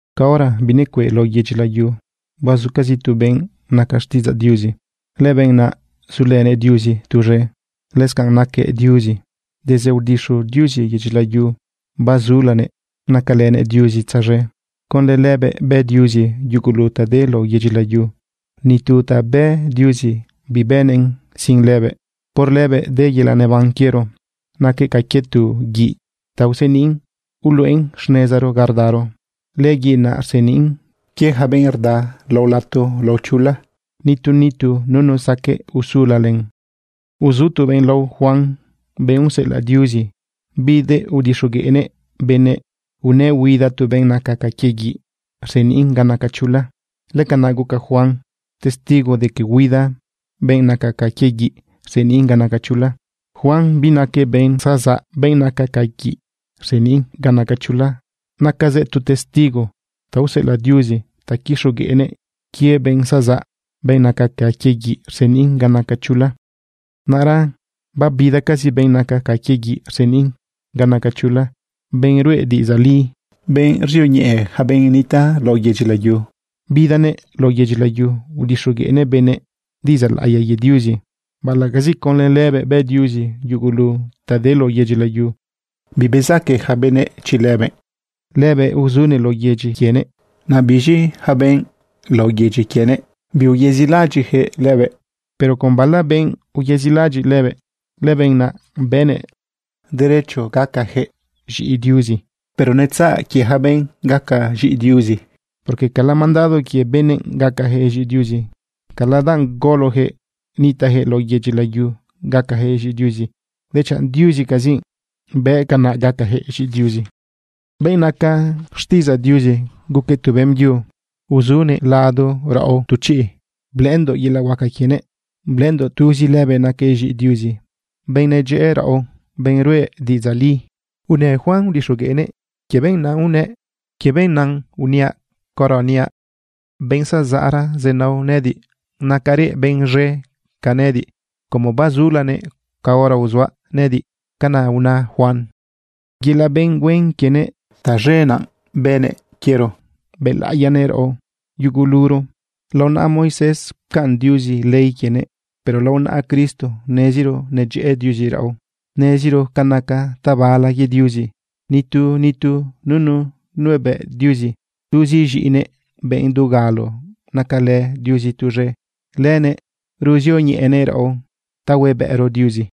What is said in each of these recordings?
Caora binecueꞌ lao yedyi layu, bazucazi tu benꞌ naca xtiꞌidzaꞌ Diuzi. Lëbenꞌ naꞌ zulënëꞌ Diuzi tuz̃e, lëscanꞌ naquëꞌ Diuzi. Desde aodixu Diuzi yedyi layu, bazulanëꞌ nacalënëꞌ Diuzi tzaz̃e. Conlë lëbëꞌ bë Diuzi yugulu ta de lao yedyi layu. Ni tu ta bë Diuzi bibënnëꞌn sin lëbëꞌ. Por lëbëꞌ de yelaꞌ neban quiero. Naquëꞌ ca quie tu guiꞌ ta useniꞌn uluꞌen xnezaro ga rdaro. Lëguiꞌ naꞌ rseniꞌn quie yaca benꞌ rda lao lato lao chula. Nitu nitu nunu saqueꞌ usula len. Uzu tu benꞌ lao Juan, benꞌ useꞌelaꞌ Diuzi. Bidëꞌ udixogueꞌnëꞌ benëꞌ unëꞌ huida tu benꞌ naca ca quie guiꞌ rseniꞌn ga naca chula. Lëcanaꞌ guca Juan testigo de que huida benꞌ naca ca quie guiꞌ rseniꞌn ga naca chula. Juan binaquëꞌ benꞌ zazaꞌ, benꞌ naca ca guiꞌ rseniꞌn ga naca chula. Nacazëꞌ tu testigo ta useꞌelaꞌ Diuzi ta quixogueꞌnëꞌ quie benꞌ zazaꞌ, benꞌ naca ca quie guiꞌ rseniꞌn ga naca chula. Naꞌra babidacazi benꞌ naca ca quie guiꞌ rseniꞌn ga naca chula, benꞌ ruꞌe diꞌidzaꞌ li, benꞌ ruzioñeꞌe yaca benꞌ nitaꞌ lao yedyi layu. Bidanëꞌ lao yedyi layu. Udixogueꞌnëꞌ benëꞌ diꞌidzaꞌ laꞌiya quie Diuzi. Baꞌalaꞌcazi conlë lëbëꞌ bë Diuzi yugulu ta de lao yedyi layu, bibezaque yaca benëꞌ chi lëbëꞌ. Lëbëꞌ uzunëꞌ lao yedyi quienëꞌ, naꞌ biz̃i yaca benꞌ lao yedyi quienëꞌ, biuyezilaꞌadyiꞌyaquëꞌ lëbëꞌ. Pero con bala benꞌ uyezilaꞌadyiꞌ lëbëꞌ, lëbenꞌ naꞌ bëꞌnëꞌ derecho gacayaquëꞌ z̃iꞌi Diuzi. Pero netzaꞌ quie yaca benꞌ gaca z̃iꞌi Diuzi, porque cala mandado quie benëꞌ gacajëꞌ z̃iꞌi Diuzi, cala danꞌ golojëꞌ nitaꞌjëꞌ lao yedyi layu gacajëꞌ z̃iꞌi Diuzi, dechanꞌ Diuzicazi bë canaꞌ gacajëꞌ z̃iꞌi Diuzi. Benꞌ naca xtiꞌidzaꞌ Diuzi guquëꞌ tu beꞌmbyu. Uzunëꞌ lado raꞌo tu chiꞌ. Blëꞌëndoꞌ yelaꞌ huaca quienëꞌ, blëꞌëndoꞌ tuzi lëbëꞌ naquëꞌ z̃iꞌi Diuzi, benꞌ nedyëꞌë raꞌo, benꞌ ruꞌe diꞌidzaꞌ li. Unë Juan udixogueꞌnëꞌ quie benꞌ naꞌ unëꞌ: ―Quie benꞌ naꞌ uniaꞌ caora niaꞌ benꞌ zazaꞌra zenao nëꞌëdiꞌ, nacarëꞌ benꞌ z̃e ca nëꞌëdiꞌ como bazulanëꞌ caora uzuaꞌ nëꞌëdiꞌ. ―Canaꞌ una Juan. Yelaꞌ benꞌ huen quienëꞌ taz̃e naꞌ bënëꞌ quiero bëlaꞌiyanëꞌ raꞌo yuguluro. Lao naꞌa Moisés pcaꞌn Diuzi ley quienëꞌ. Pero lao naꞌa Cristo neziro nedyëꞌë Diuzi raꞌo, neziro ca naca tabala quie Diuzi. Nitu nitu nunu nuebëꞌ Diuzi. Tuzi z̃iꞌinëꞌ, benꞌ dugalo nacalë Diuzi tuz̃e, lënëꞌ ruzioñeꞌenëꞌ raꞌo ta huebëꞌro Diuzi.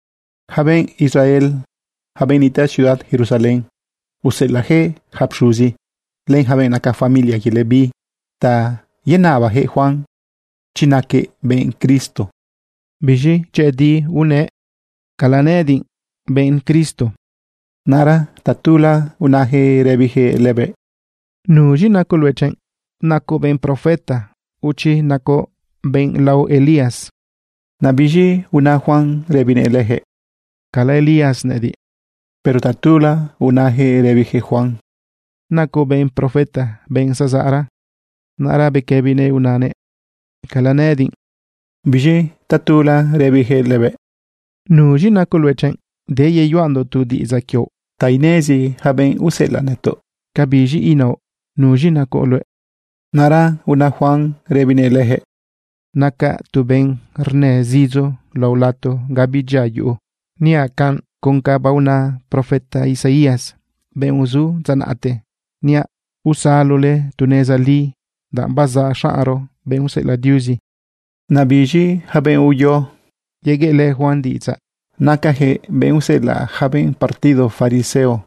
Yaca benꞌ Israel, yaca benꞌ nitaꞌ ciudad Jerusalén, useꞌelaꞌyaquëꞌ yaca pxuzi len yaca benꞌ naca familia quie Leví ta yenabayaquëꞌ Juan chi naquëꞌ benꞌ Cristo. Biz̃i dyëꞌëdi unëꞌ: ―Cala nëꞌëdiꞌ benꞌ Cristo. Naꞌra tatula unayaquëꞌ rëbiyaquëꞌ lëbëꞌ: ―¿Nuz̃i nacoꞌ luëꞌ chiꞌ? ¿Nacoꞌ benꞌ profeta, o chi nacoꞌ benꞌ lao Elías? Naꞌ biz̃i una Juan rëbinëꞌ leyaquëꞌ: ―Cala Elías nëꞌëdiꞌ. Pero tatula unayaquëꞌ rëbiyaquëꞌ Juan: ―¿Nacoꞌ benꞌ profeta, benꞌ zazaꞌra? Naꞌra bequëbinëꞌ unanëꞌ: ―Cala nëꞌëdiꞌ. Biz̃i tatula rëbiyaquëꞌ lëbëꞌ: ―¿Nuz̃i nacoꞌ luëꞌ chiꞌ? Deyeyuꞌandoꞌ tu diꞌidzaꞌ quioꞌ ta inezi yaca benꞌ useꞌelaꞌ nëtoꞌ. ¿Cabiz̃i inaoꞌ? ¿Nuz̃i nacoꞌ luëꞌ? Naꞌra una Juan rëbinëꞌ leyaquëꞌ: ―Nacaꞌ tu benꞌ rnë zidzo lao lato ga bidyia yuꞌu. Niaꞌ canꞌ con ca baona profeta Isaías, benꞌ uzu dza naꞌte, niaꞌ: “Usalole tu neza li, danꞌ bazaꞌ xaꞌnro, benꞌ useꞌelaꞌ Diuzi.” Naꞌ biz̃i yaca benꞌ uyo yegueꞌlë Juan diꞌidzaꞌ, nacayaquëꞌ benꞌ useꞌelaꞌ yaca benꞌ partido fariseo.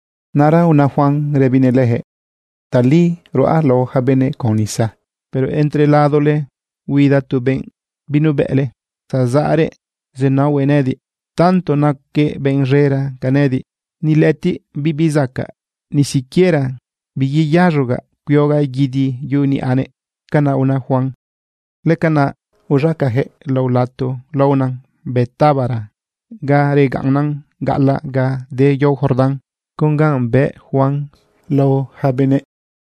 Naꞌra una Juan rëbinëꞌ leyaquëꞌ: ―Tali ruꞌa lao yaca benëꞌ con nisa, pero entre ladole huida tu benꞌ binubëꞌle. Zazaꞌrëꞌ zenaohuëꞌ nëꞌëdiꞌ. Tanto naquëꞌ benꞌ z̃era ca nëꞌëdiꞌ, ni lëꞌëtiꞌ bibi zacaꞌ ni siquiera biyeyaz̃ogaꞌ cuiogaꞌ guidi yuꞌu niꞌanëꞌ. ―Canaꞌ una Juan. Lëcanaꞌ uz̃acayaquëꞌ lao lato laona Betábara, ga regaꞌnnan gaꞌalaꞌ ga de yao Jordán, con ganꞌ bëꞌ Juan lao yaca benëꞌ.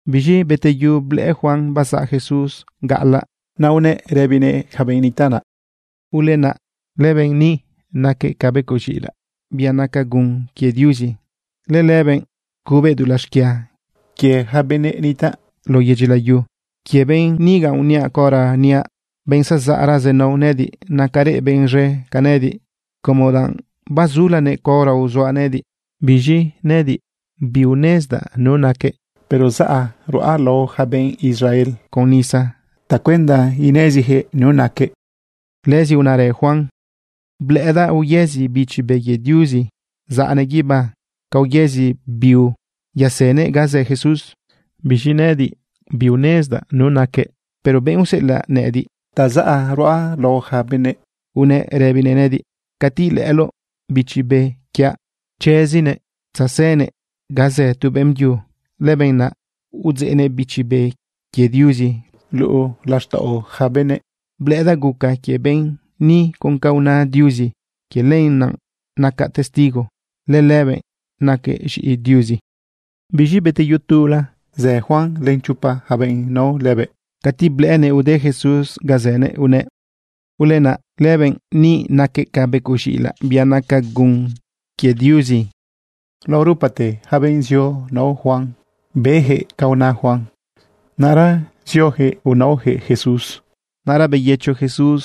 Biz̃i beteyu blëꞌë Juan bazaꞌ Jesús gaꞌalaꞌ. Naꞌ unëꞌ rëbinëꞌ yaca benꞌ nitaꞌ naꞌ: ―Ulenaꞌ, lëbenꞌ ni naquëꞌ ca becoꞌ z̃iꞌilaꞌ, bia naca gun quie Diuzi. Lëlëbëꞌ cubëꞌ dulaꞌ xquia quie yaca benëꞌ nitaꞌ lao yedyi layu. Quie benꞌ niga uniaꞌ caora niaꞌ: “Benꞌ zazaꞌra zenao nëꞌëdiꞌ, nacarëꞌ benꞌ z̃e ca nëꞌëdiꞌ, como danꞌ bazulanëꞌ caora uzuaꞌ nëꞌëdiꞌ.” Biz̃i nëꞌëdiꞌ biunezdaꞌ nu naquëꞌ, pero zaꞌ ruꞌa lao yaca benꞌ Israel con nisa tacuenda ineziyaquëꞌ nu naquëꞌ. Lëzi unarë Juan: ―Blëꞌëdaꞌ uyezi Bichi Be quie Diuzi, zaꞌnëꞌ guibá ca uyezi biu, yasënëꞌ ga zë Jesús. Biz̃i nëꞌëdiꞌ biunezdaꞌ nu naquëꞌ. Pero benꞌ useꞌelaꞌ nëꞌëdiꞌ ta zaꞌ ruꞌa lao yaca benëꞌ unëꞌ rëbinëꞌ nëꞌëdiꞌ: “Cati ilëꞌëloꞌ Bichi Be quiaꞌ chezinëꞌ tzasënëꞌ ga zë tu beꞌmbyu, lëbenꞌ naꞌ udzeꞌnëꞌ Bichi Be quie Diuzi luꞌu laxtaꞌo yaca benëꞌ.” Blëꞌëdaꞌ guca quie benꞌ ni con ca una Diuzi. Quie lenaꞌ nacaꞌ testigo lëlëbëꞌ naquëꞌ z̃iꞌi Diuzi. Biz̃i beteyu tula, zë Juan len chopa yaca benꞌ nao lëbëꞌ. Cati blëꞌënëꞌ ude Jesús ganꞌ zënëꞌ unëꞌ: ―Ulenaꞌ, lëbenꞌ ni naquëꞌ ca becoꞌ z̃iꞌilaꞌ, bia naca gun quie Diuzi. Lao rupate yaca benꞌ zio nao Juan, beyaquëꞌ ca una Juan. Naꞌra zioyaquëꞌ unaoyaquëꞌ Jesús. Naꞌra beyëcho Jesús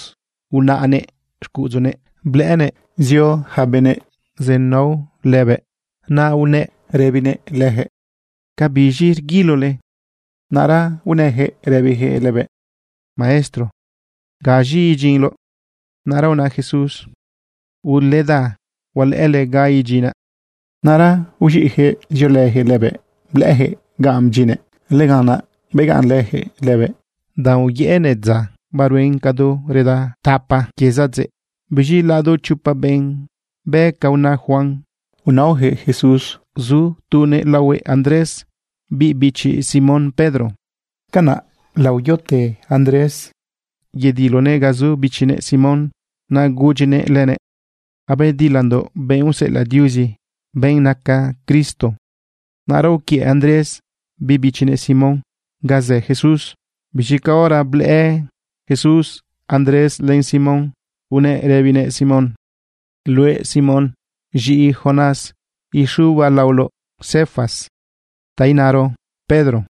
unaꞌnëꞌ xcuꞌudzunëꞌ blëꞌënëꞌ zio yaca benëꞌ zenao lëbëꞌ. Naꞌ unëꞌ rëbinëꞌ leyaquëꞌ: ―¿Cabiz̃i rguilole? Naꞌra unëyaquëꞌ rëbiyaquëꞌ lëbëꞌ: ―Maestro, ¿gaz̃i idyinloꞌ? Naꞌra una Jesús: ―Uleda, hualëꞌële ganꞌ idyinaꞌ. Naꞌra uz̃iꞌyaquëꞌ ziolëyaquëꞌ lëbëꞌ blëꞌëyaquëꞌ ganꞌ bdyinnëꞌ. Lëganꞌ naꞌ begaꞌnlëyaquëꞌ lëbëꞌ danꞌ uyëꞌënëꞌ dza, baruen cadu reda tapa quie zadzeꞌ. Biz̃i lado chopa benꞌ be ca una Juan unaoyaquëꞌ Jesús, zu tunëꞌ laohuëꞌ Andrés, biꞌ bichi Simón Pedro. Canaꞌ laoyote Andrés yedilonëꞌ ga zu bichinëꞌ Simón, naꞌ gudyinëꞌ lënëꞌ: ―Abedilandoꞌ benꞌ useꞌelaꞌ Diuzi, benꞌ naca Cristo. Naꞌra uquiëꞌ Andrés biꞌ bichinëꞌ Simón ganꞌ zë Jesús. Biz̃i caora blëꞌë Jesús Andrés len Simón, unëꞌ rëbinëꞌ Simón: ―Luëꞌ Simón, z̃iꞌi Jonás, ixubaꞌ laoloꞌ Cefas, ta inaro: Pedro.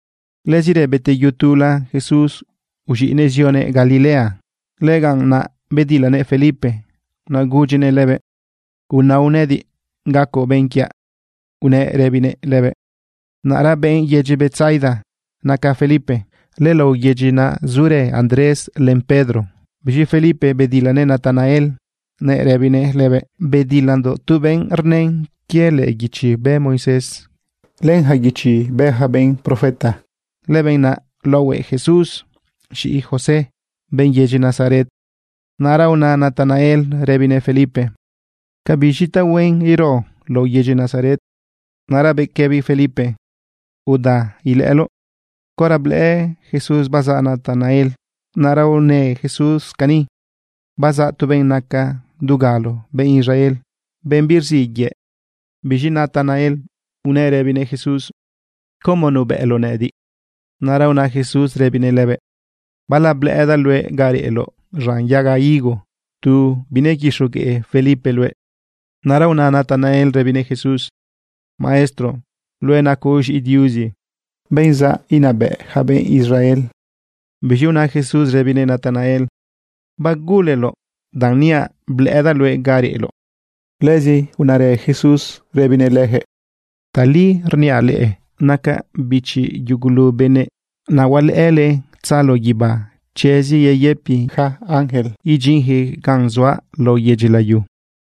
Lëzirë beteyu tula, Jesús uz̃iꞌnëꞌ zionëꞌ Galilea. Lëganꞌ naꞌ bedilanëꞌ Felipe, naꞌ gudyinëꞌ lëbëꞌ: ―Unao nëꞌëdiꞌ gacoꞌ benꞌ quiaꞌ ―unëꞌ rëbinëꞌ lëbëꞌ. Naꞌra benꞌ yedyi Betsaida naca Felipe. Lëlao yedyi naꞌ zurë Andrés len Pedro. Biz̃i Felipe bedilanëꞌ Natanael nëꞌ rëbinëꞌ lëbëꞌ: ―Bedilandoꞌ tu benꞌ rnën quie lëꞌë guichi bë Moisés, len yaca guichi bë yaca benꞌ profeta. Lëbenꞌ naꞌ laohuëꞌ Jesús, z̃iꞌi José, benꞌ yedyi Nazaret. Naꞌra una Natanael rëbinëꞌ Felipe: ―¿Cabiz̃i tu tahuen ero lao yedyi Nazaret? Naꞌra bequëbi Felipe: ―Uda, ilëꞌëloꞌ. Caora blëꞌë Jesús bazaꞌ Natanael, naꞌra unë Jesús cani: ―Bazaꞌ tu benꞌ naca dugalo benꞌ Israel, benꞌ birziꞌ yëꞌ. Biz̃i Natanael unëꞌ rëbinëꞌ Jesús: ―¿Cómo nubëꞌloꞌ nëꞌëdiꞌ? Naꞌra una Jesús rëbinëꞌ lëbëꞌ: ―Bala blëꞌëdaꞌ luëꞌ ga reꞌloꞌ z̃an yaga higo tu binequixogueꞌ Felipe luëꞌ. Naꞌra una Natanael rëbinëꞌ Jesús: ―Maestro, luëꞌ nacoꞌ z̃iꞌi Diuzi, benꞌ zaꞌ inabëꞌ yaca benꞌ Israel. Biz̃i una Jesús rëbinëꞌ Natanael: ―¿Baguleloꞌ danꞌ niaꞌ blëꞌëdaꞌ luëꞌ ga reꞌloꞌ? Lëzi unarë Jesús rëbinëꞌ leyaquëꞌ: ―Tali rniaꞌ leꞌe, nacaꞌ bichi yugulu benëꞌ, naꞌ hualëꞌële tzalo guibá chezi yeyëpi yaca ángel idyinjëꞌ gan zuaꞌ lao yedyi layu.